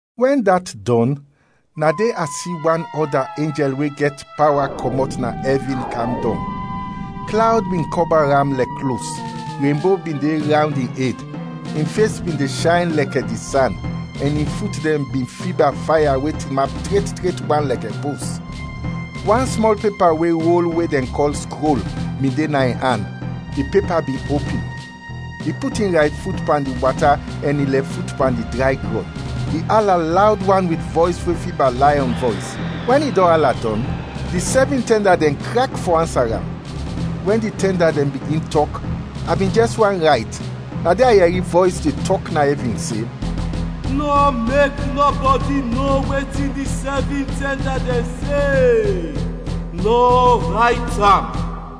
Wɛn dat dɔn, na de a si wan ɔda enjɛl we gɛt pawa kɔmɔt na ɛvin kam dɔng. Klawd bin kɔba am lɛkɛ klos, renbo bin de rawnd in ed; in fes bin de shayn lɛkɛ di san, ɛn in fut dɛn bin fiba faya we tinap tret tret wan lɛkɛ pos. Wan smɔl pepa we rol we dɛn kɔl “skrol” bin de na in an, di pepa bin opin. I put in rayt fut pan di wata ɛn in lɛf fut pan di dray grɔn. I ala lawd wan wit vɔys we fiba layɔn vɔys. Wɛn i dɔn ala dɔn, di sɛvin tɛnda dɛn krak fɔ ansa am. Wɛn di tɛnda dɛn bigin tɔk, a bin jɛs want rayt, na de a yɛri vɔys de tɔk na ɛvin se, “Nɔ mek nɔbɔdi no wetin di sɛvin tɛnda dɛn se; nɔ rayt am!”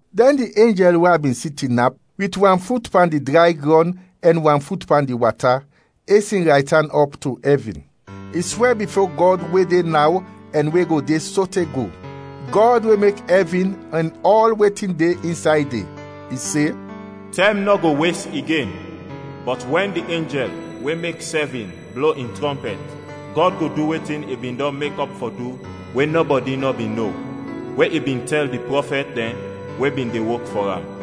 Dɛn di enjɛl we a bin si tinap, wit wan fut pan di dray grɔn ɛn wan fut pan di wata, es in raytan ɔp to ɛvin. I swɛ bifo Gɔd we de naw ɛn we go de sote go, Gɔd we mek ɛvin ɛn ɔl wetin de insay de. I se, “Tɛm nɔ go wes igen! Bɔt wɛn di enjɛl we mek sɛvin blo in trɔmpɛt, Gɔd go du wetin i bin dɔn mekɔp fɔ du we nɔbɔdi nɔ bin no, we i bin tɛl di prɔfɛt dɛn we bin de wok fɔ am.”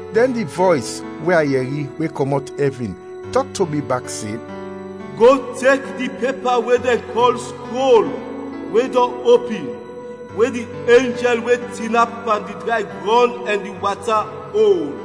Dɛn di vɔys, we a yɛri, we kɔmɔt ɛvin, tɔk to mi bak se, “Go tek di pepa we dɛn kɔl skrol, we dɔn opin, we di enjɛl we tinap pan di dray grɔn ɛn di wata, ol.”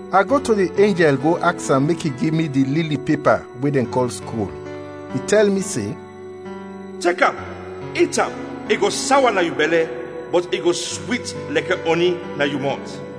A go to di enjɛl go aks am mek i gi mi di lili pepa we dɛn kɔl skrol. I tɛl mi se, “Tek am, it am, i go sawa na yu bɛlɛ, bɔt i go swit lɛkɛ ɔni na yu mɔt.”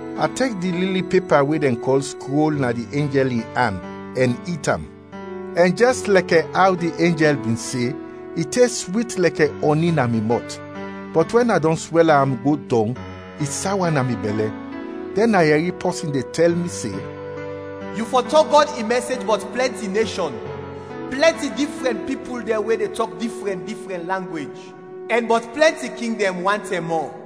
A tek di lili pepa we dɛn kɔl skrol na di enjɛl in an, ɛn it am; ɛn jɛs lɛkɛ aw di enjɛl bin se, i tes swit lɛkɛ ɔni na mi mɔt. Bɔt wɛn a dɔn swɛla am go dɔng, i sawa na mi bɛlɛ. Dɛn a yɛri pɔsin de tɛl mi se, “Yu fɔ tɔk Gɔd in mɛsej bɔt plɛnti neshɔn, plɛnti difrɛn pipul dɛn we de tɔk difrɛn difrɛn langwej, ɛn bɔt plɛnti king dɛn wan tɛm mɔ.”